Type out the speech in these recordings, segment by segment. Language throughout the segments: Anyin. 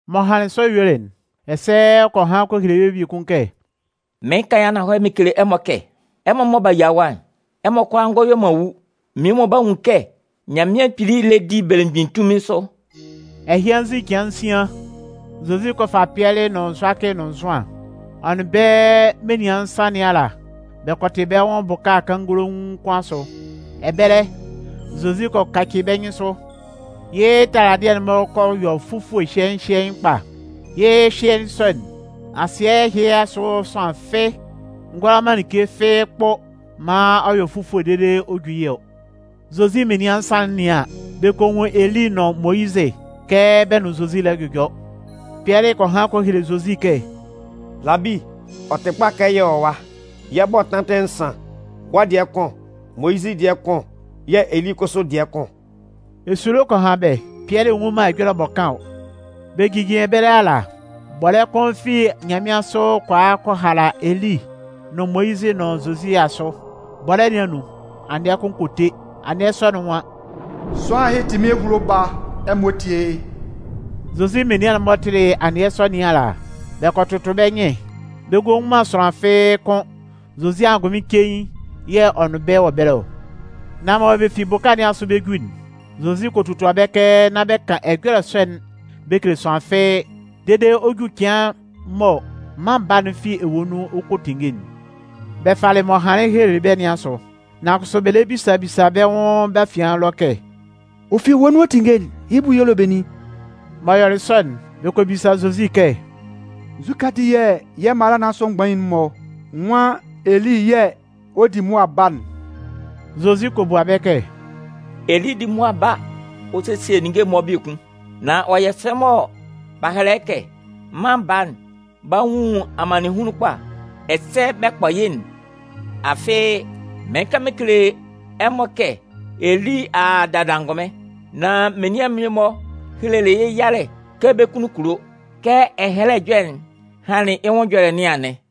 M'ɔ hanlɩn sɔ yuelɩ'n, ɛsɛ ɔ kɔ han kɔ hele bɛ́ biekun kɛ: “Mɩɩn kan yɩ́ ananhɔlɛ mɩn kele ɛmɔ kɛ, ɛmɔ mɔ b'a yia ɛwa'n, ɛmɔ kʋalaa ngɔ yue man wu. Mmie-mɔ 'ba nwun kɛ Nyanmɩan Kpili lɛ di belemgbin tunmin sʋ.” Ɛhɩ anzin cɩan nsian, Zozi kɔ fa Pɩɛlɩ nʋn Zʋakɩ nʋn Zʋan. Ɔ nʋn bɛ́ menian nsan nɩn ala bɛ kɔ tɩ bɛ́ nwʋn bʋka kannganlaun kʋn asʋ. Ɛbɛlɛ, Zozi kɔ kaci bɛ́ nyɩnsʋ. Yɩ́ taladɩɛ'n kɔ yɔ fufue hyɩɛɩn hyɩɛɩn kpa. Yɩ́ hyɩɛɩn sɔ'n, asɩɛ ɛhɩ asʋ sʋanlan fɩ́ɩ́ ngʋala man like fɩ́ɩ́ kpʋ maan ɔ yɔ fufue dede ɔ ju yɩ́ ɔ. Zozi menian nsan'n 'nɩan an, bɛ kɔ nwun Eli nʋn Moyizɩ kɛ bɛ nʋn Zozi lɛ jʋjɔ. Pɩɛlɩ kɔ han kɔ hele Zozi kɛ: “Labi, ɔ tɩ kpa kɛ yɛ wɔ ɛwa. Yɛ 'bɔ tantɩ nsan, wɔ́ dɩɛ kʋn, Moyizɩ dɩɛ kʋn yɛ̂ Eli kʋsʋ dɩɛ kʋn.” Esulo kɔ han bɛ́, Pɩɛlɩ nnwun man ɛjɔlɛ m'ɔ kan ɔ. Bɛ jijin ɛbɛlɛ ala, bɔlɛ́ kʋn fi nyanmɩansʋ kɔ a kɔ hala Eli nʋn Moyizɩ nʋn Zozi asʋ. Bɔlɛ́ nɩn anun, anɩɛ kʋn kɔ te. Anɩɛ sɔ'n nwan: “Sʋanlan ɛhɩ tɩ mɩ́n ehulo Baa, ɛmɔ tíe yɩ́!” Zozi menian'n-mɔ tɩlɩ anɩɛ sɔ nɩn ala, bɛ kɔ tʋtʋ bɛ́ nyɩn, bɛ ngɔ nwun sʋanlan fɩ́ɩ́ kʋ́n, Zozi angʋnmɩn cein yɛ̂ ɔ nʋn bɛ́ wɔ ɛbɛlɛ ɔ. Nan mɔ bɛ fi bʋka nɩn asʋ bɛ 'ju'n, Zozi kɔ totua bɛ́ kɛ nán bɛ kan ɛjɔlɛ sɔ'n bɛ kele sʋanlan fɩ́ɩ́, dede ɔ jú cɩan mɔ Mân Baa'n fi ewue nun ɔ kɔ tinnge'n. Bɛ falɩ m'ɔ hanlɩn helelɩ bɛ́ nɩn asʋ, nan kʋsʋ bɛ lɛ bisa bisa bɛ́ nwʋn bɛ́ afian ɛlɔ kɛ: “Ɔ fi ewue nun ɔ 'tinnge'n, yɩ́ bʋ y'ɔ le benin?” M'ɔ yɔlɩ sɔ'n, bɛ kɔ bisa Zozi kɛ: “Nzukɛ ati yɛ̂ mala nɩn asʋ mgbain'n-mɔ nwan Eli yɛ̂ ɔ 'di mʋa ba'n?” Zozi kɔ bua bɛ́ kɛ: “Eli 'di mʋa ba ɔ sesie ninnge'n-mɔ biekun. Nan ɔ yɔ sɛ mɔ b'a hɛlɛ yɩ́ kɛ, Mân Baa'n 'ba nwun amannɩnhunlun kpa, ɛsɛ bɛ 'kpɔ yɩ́'n? Afɩ, mɩɩn kan mɩn kele ɛmɔ kɛ Eli a a dada angʋnmɩn. Nan menian'n-mɔ helelɩ yɩ́ yalɛ kɛ bɛ́ kunnun kulo. Kɛ Ɛhɛlɛ Ɛjɔlɛ'n hanlɩn yɩ́ nwʋn ɛjɔlɛ nɩn anɩn.”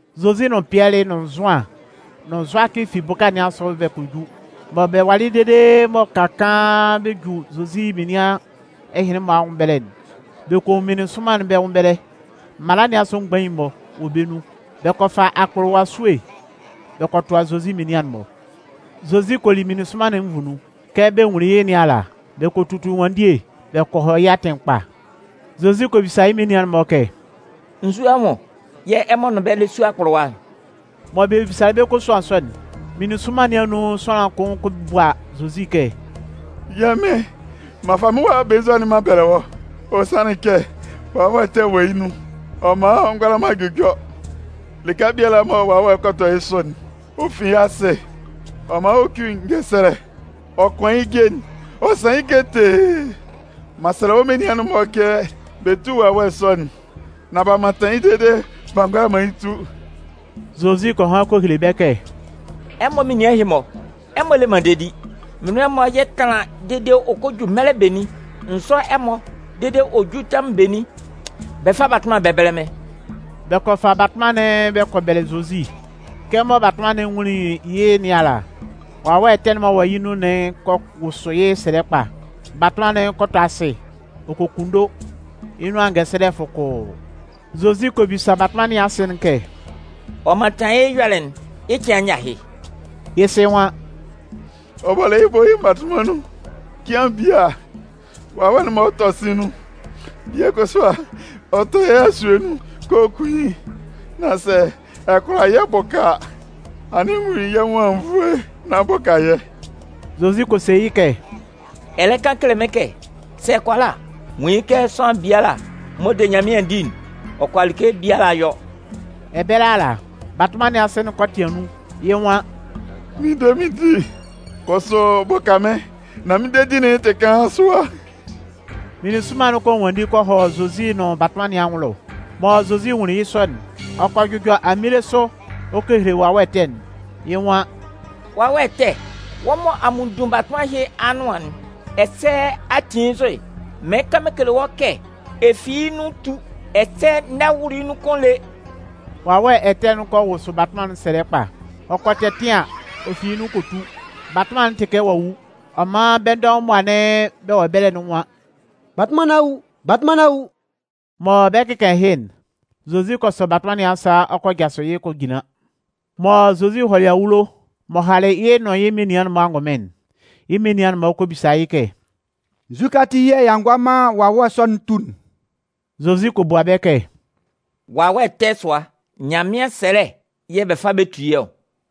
Zozi nʋn Pɩɛlɩ nʋn Zʋan nʋn Zʋakɩ fi bʋka nɩn asʋ bɛ kɔ ju. Mɔ bɛ walɩ dede mɔ bɛ ka kaan bɛ ju Zozi menian ɛhɩnlɩn-mɔ anwʋn ɛbɛlɛ'n, bɛ kɔ nwun meninsʋnman bɛ́ nwʋn ɛbɛlɛ. Mala nɩn asʋ mgbain'n-mɔ wɔ bɛ́ nun. Bɛ kɔ fa akpʋlʋwa esue bɛ kɔ tʋa Zozi menian'n-mɔ. Zozi kɔ li meninsʋnman'n nvu nun. Kɛ bɛ nwunlin yɩ́ nɩn ala, bɛ kɔ tutu ɛnwanndie bɛ kɔ hɔ yɩ́ atɩn ɛkpa. Zozi kɔ bisa yɩ́ menian'n-mɔ kɛ: “Nzu anwʋn yɛ̂ ɛmɔ nʋn bɛ́ lɛ su akpʋlʋwa'n?” M'ɔ bisalɩ bɛ́ kosuan sɔ'n, meninsʋnman nɩn anun sʋanlan kʋn kɔ bua Zozi kɛ: “Yɛ́ Mɩn, m'an fa mɩ́n wa belenzua'n m'an bɛlɛ wɔ́. Ɔ sanlɩn kɛ wawɛ ɛtɛ wɔ yɩ́ nun. Ɔ man ɔ ngʋala man jʋjɔ. Lɩka biala mɔ wawɛ'n kɔ tɔ yɩ́ sʋ'n, ɔ fin yɩ́ asɩ. Ɔ man ɔ cuin ngɛsɛlɛ, ɔ kʋan yɩ́ je'n, ɔ san yɩ́ ketee. M'an sɛlɛ wɔ́ menian'n-mɔ kɛ bɛ tú wawɛ ɛtɛ sɔ'n. Nan b'a mantan yɩ́ dede b'a ngʋala man yɩ́ tu.” Zozi kɔ han kɔ hele bɛ́ kɛ: “Ɛmɔ menian ɛhɩ-mɔ, ɛmɔ le man dedi. Mɩn nʋn ɛmɔ yɛ tánlan dede ɔ hɔ́ jú mɛlɛ benin? N zʋ́ ɛmɔ dede ɔ jú tɛmʋn benin? Bɛ fá batʋnman'n bɛ bɛ́lɛ mɩ́n.” Bɛ kɔ fa batʋnman'n bɛ kɔ bɛlɛ Zozi. Kɛmɔ batʋnman'n nwunlin yɩ́ nɩn ala, wawɛ ɛtɛ'n m'ɔ wɔ yɩ́ nun'n kɔ wʋsʋ yɩ́ sɛlɛ kpa. Batʋnman'n kɔ tɔ asɩ ɔ kɔ kunndo, yɩ́ nʋan ngɛsɛlɛ fʋkʋʋ. Zozi kɔ bisa batʋnman nɩn asɩ'n kɛ: “Ɔ mantanlɩn yɩ́ ɛyɔlɛ'n yɩ́ cɩan nyɛ ahɩ?” Yɩ́ sɩ nwan: “Ɔ bɔlɩ yɩ́ bʋ yɩ́ mmatʋnman nun. Cɩan bie a, wawɛ'n man ɔ tɔ sɩ̂n nun. Bie kʋsʋ a, ɔ tʋ yɩ́ asue nun kɛ ɔ 'kun yɩ́. Nan sɛ ɛ kʋala yɛ́ bʋka a, anɩn nwun yɛ́ nwʋn anwunnvoe nán bʋka yɛ́.” Zozi kɔ se yɩ́ kɛ: “Ɛ lɛ kan kele mɩ́n kɛ: ‘Sɛ ɛ kʋala a!’ Nwun yɩ́ kɛ sʋanlan biala m'ɔ de Nyanmɩan di'n, ɔ kʋala like biala yɔ.” Ɛbɛlɛ ala, batʋnman nɩn asɩ'n kɔ tɩan nun, yɩ́ nwan: “Mɩn de mɩn di, kʋsʋ bʋka mɩ́n nán mɩ́n dedi'n tɩ kaan sʋa!” Meninsʋnman'n kɔ nwanndi kɔ hɔ Zozi nʋn batʋnman nɩn anwʋn ɛlɔ. Mɔ Zozi nwunlin yɩ́ sɔ'n, ɔ kɔ jʋjɔ aminle sʋ ɔ kɔ hele wawɛ ɛtɛ'n, yɩ́ nwan: “Wawɛ ɛtɛ, wɔ́ mɔ a munndun batʋnman ɛhɩ anʋan'n ɛsɛ a ti yɩ́ nzʋ'n, mɩɩn kan mɩn kele wɔ́ kɛ ɛ fi yɩ́ nun tú, ɛsɛ n'ɛ wʋlʋ yɩ́ nun kʋ́n lé!” Wawɛ ɛtɛ'n kɔ wʋsʋ batʋnman'n sɛlɛ kpa. Ɔ kɔ tɛtɩan ɔ fi yɩ́ nun kɔ tu. Batʋnman'n tɩ kɛ ɔ'a wu. Ɔ man bɛ́ dɔʋn mɔ anɩn bɛ wɔ ɛbɛlɛ'n nwan: “Batʋnman nɩn a wu! Batʋnman nɩn a wu!” Mɔ bɛ 'kɩkan ɛhɩ'n, Zozi kɔ sɔ batʋnman nɩn asa ɔ kɔ jasʋ yɩ́ kɔ jinlan. Mɔ Zozi hɔlɩ awulo m'ɔ halɩ yɩ́ nʋn yɩ́ menian'n-mɔ angʋnmɩn'n, yɩ́ menian'n-mɔ kɔ bisa yɩ́ kɛ: “Nzukɛ ati yɛ̂ y'a ngʋala man wawɛ sɔ'n tu'n?” Zozi kɔ bua bɛ́ kɛ: “Wawɛ ɛtɛ sʋa, Nyanmɩan ɛsɛlɛ yɛ̂ bɛ fa bɛ tu yɩ́ ɔ.”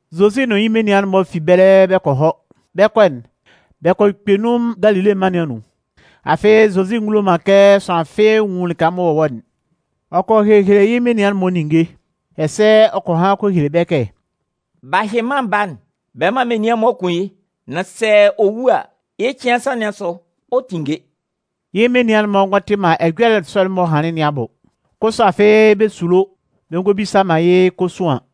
Zozi nʋn yɩ́ menian'n-mɔ fi ɛbɛlɛ bɛ kɔ hɔ. Bɛ 'kɔ'n, bɛ kɔ kpɛ nun Galile mân nɩn anun. Afɩ Zozi ngulo man kɛ sʋanlan fɩ́ɩ́ nwun lɩka m'ɔ wɔ'n. Ɔ kɔ hehele yɩ́ menian'n-mɔ ninnge, ɛsɛ ɔ kɔ han kɔ hele bɛ́ kɛ: “Bɛ 'ba hyɩ Mân Baa'n bɛ man menian'n-mɔ kun yɩ́. Nan sɛ ɔ wu a, yɩ́ cɩan nsan nɩn asʋ, ɔ 'tinnge.” Yɩ́ menian'n-mɔ ngɔ tɩ man ɛjɔlɛ sɔ'n m'ɔ hanlɩn nɩn abʋ. Kʋsʋ afɩ bɛ sulo bɛ ngɔ bisa man yɩ́ kosuan.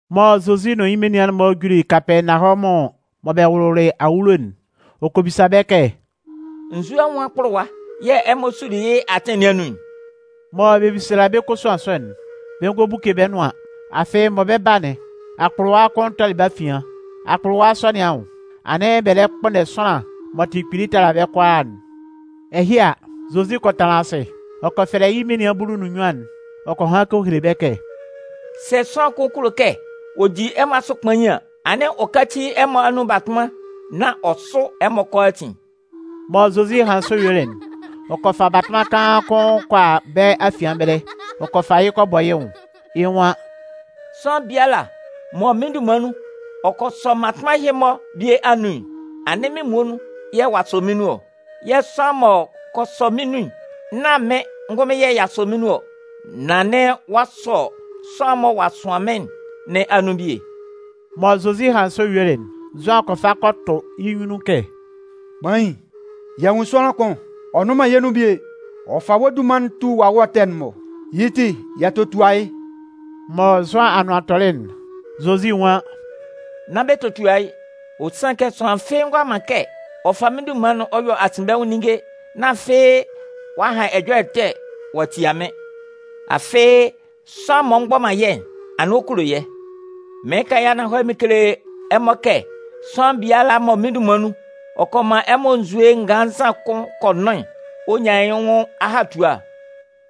Mɔ Zozi nʋn yɩ́ menian'n-mɔ juli Kapɛɛnawɔmʋn mɔ bɛ wʋlʋlɩ awulo'n, ɔ kɔ bisa bɛ́ kɛ: “Nzu anwʋn akpʋlʋwa yɛ̂ ɛmɔ suli yɩ́ atɩn nɩn anun'n?” M'ɔ bisalɩ bɛ́ kosuan sɔ'n, bɛ ngɔ buke bɛ́ nʋan. Afɩ mɔ bɛ 'ba'n, akpʋlʋwa kʋn tɔlɩ bɛ́ afian. Akpʋlʋwa sɔ nɩn anwʋn, anɩn bɛ lɛ kpʋnndɛ sʋanlan m'ɔ tɩ kpili tala bɛ́ kʋalaa'n. Ɛhɩ a, Zozi kɔ tanlan asɩ. Ɔ kɔ fɛlɛ yɩ́ menian bulu nʋn nnyuan'n ɔ kɔ han kɔ hele bɛ́ kɛ: “Sɛ sʋanlan kʋn kulo kɛ ɔ di ɛmɔ asʋ kpain an, anɩn ɔ káci ɛmɔ anun batʋnman nán ɔ sʋ́ ɛmɔ kʋalaatin.” Mɔ Zozi hanlɩn sɔ yuelɩ'n, ɔ kɔ fa batʋnman kaan kʋn kɔ a bɛ́ afian ɛbɛlɛ. Ɔ kɔ fa yɩ́ kɔ bɔ yɩ́ nwʋn. Yɩ́ nwan: “Sʋanlan biala mɔ mɩ́n dunman nun, ɔ kɔ sɔ mmatʋnman ɛhɩ-mɔ bie anun'n, anɩn mɩ́n muonun yɛ̂ ɔ'a sɔ mɩ́n nun ɔ. Yɛ̂ sʋanlan m'ɔ kɔ sɔ mɩ́n nun'n, nán mɩ́n ngʋnmɩn yɛ̂ ɔ'a sɔ mɩn nun ɔ. Nan anɩn ɔ'a sɔ sʋanlan'n mɔ ɔ'a sʋan mɩ́n nɩn anun bie.” Mɔ Zozi hanlɩn sɔ yuelɩ'n, Zʋan kɔ fa kɔ tʋ yɩ́ nyunnun kɛ: “Kpain, y'a nwun sʋanlan kʋn, ɔ nnʋn man yɛ́ nun bie. Ɔ fa wɔ́ dunman'n ɔ tu wawɛ ɛtɛ'n-mɔ. Yɩ́ ti, y'a totua yɩ́.” Mɔ Zʋan anʋan tɔlɩ'n, Zozi nwan: “Nán bɛ totua yɩ́. Ɔ sanlɩn kɛ sʋanlan fɩ́ɩ́ ngʋala man kɛ ɔ fa mɩ́n dunman'n ɔ yɔ asinbɛnwʋn ninnge, nán afɩ ɔ'a han ɛjɔlɛ ɛtɛ ɔ'a tia mɩ́n. Afɩ sʋanlan m'ɔ mgbɔ man yɛ́'n, anɩn ɔ kulo yɛ́. Mɩɩn kan yɩ́ ananhɔlɛ mɩn kele ɛmɔ kɛ sʋanlan biala mɔ mɩ́n dunman nun, ɔ kɔ man ɛmɔ nzue nganlannzan kʋn kɔ nʋn'n, ɔ 'nyan yɩ́ nwʋn ahatua.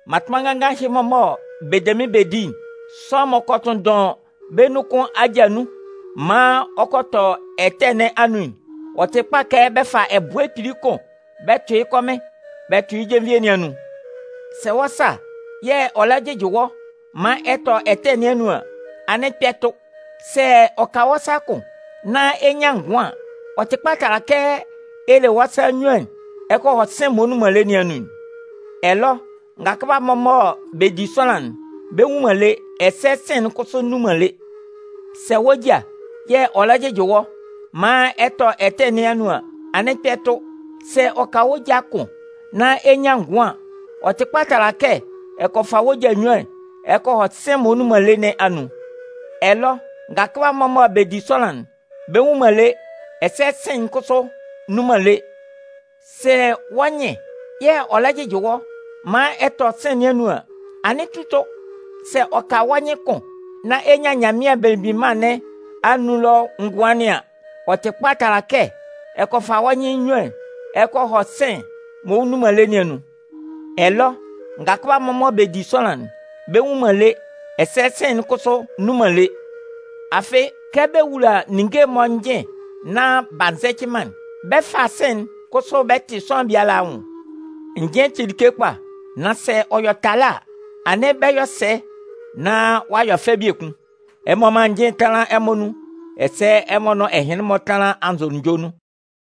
“Mmatʋnman nganngan ɛhɩ-mɔ mɔ bɛ de mɩ́n bɛ di'n, sʋanlan m'ɔ kɔ tʋnndʋn bɛ́ nun kʋn aja nun maan ɔ kɔ tɔ ɛtɛ nɩn anun'n, ɔ tɩ kpa kɛ bɛ fa ɛbʋɛ kpili kʋn bɛ tʋ yɩ́ kɔmɩn bɛ tʋ yɩ́ jenvie nɩn anun. Sɛ wɔ́ sa yɛ̂ ɔ lɛ jɩjɩ wɔ́ maan ɛ tɔ ɛtɛ nɩn anun an, anɩn kpɛ tʋ. Sɛ ɔ ka wɔ́ sa kʋn nán ɛ nyan ngʋan an, ɔ tɩ kpa tala kɛ ɛ le wɔ́ sa nnyuan'n ɛ kɔ hɔ sɩ̂n'n m'ɔ nnun man lé nɩn anun'n. [ Ɛlɔ ngakʋba'n-mɔ mɔ bɛ di sʋanlan'n, bɛ nwu man lé, ɛsɛ sɩ̂n'n kʋsʋ nnun man lé.] Sɛ wɔ́ ja yɛ̂ ɔ lɛ jɩjɩ wɔ́ maan ɛ tɔ ɛtɛ nɩn anun an, anɩn kpɛ tʋ. Sɛ ɔ ka wɔ́ ja kʋn nán ɛ nyan ngʋan an, ɔ tɩ kpa tala kɛ ɛ kɔ fa wɔ́ ja nnyuan'n ɛ kɔ hɔ sɩ̂n'n m'ɔ nnun man lé nɩn anun'n. [ Ɛlɔ ngakʋba'n-mɔ mɔ bɛ di sʋanlan'n, bɛ nwu man lé, ɛsɛ sɩ̂n'n kʋsʋ nnun man lé.] Sɛ wɔ́ nyɩn yɛ̂ ɔ lɛ jɩjɩ wɔ́ maan ɛ tɔ ɛtɛ nɩn anun an, anɩn tu tʋ. Sɛ ɔ ka wɔ́ nyɩn kʋn nán ɛ nyan Nyanmɩan Belemgbin Mân nɩn anun ɛlɔ ngʋan nɩn an, ɔ tɩ kpa tala kɛ ɛ kɔ fa wɔ́ nyɩn nnyuan'n ɛ kɔ hɔ sɩ̂n'n m'ɔ nnun man lé nɩn anun'n. Ɛlɔ ngakʋba'n-mɔ mɔ bɛ di sʋanlan'n, bɛ nwu man lé, ɛsɛ sɩ̂n'n kʋsʋ nnun man lé. Afɩ kɛ bɛ wula ninnge'n-mɔ njɩn nán b'a nzɛcɩ man'n, bɛ 'fa sɩ̂n'n kʋsʋ bɛ tɩ sʋanlan biala anwʋn. Njɩn'n tɩ like kpa. Nan sɛ ɔ yɔ talɛ́ a, anɩn bɛ 'yɔ sɛ nán ɔ a yɔ fɛ biekun? Ɛmɔ mán njɩn tánlan ɛmɔ anun, ɛsɛ ɛmɔ nʋn ɛhɩnlɩn-mɔ tánlan anzʋnunjɔ nun.”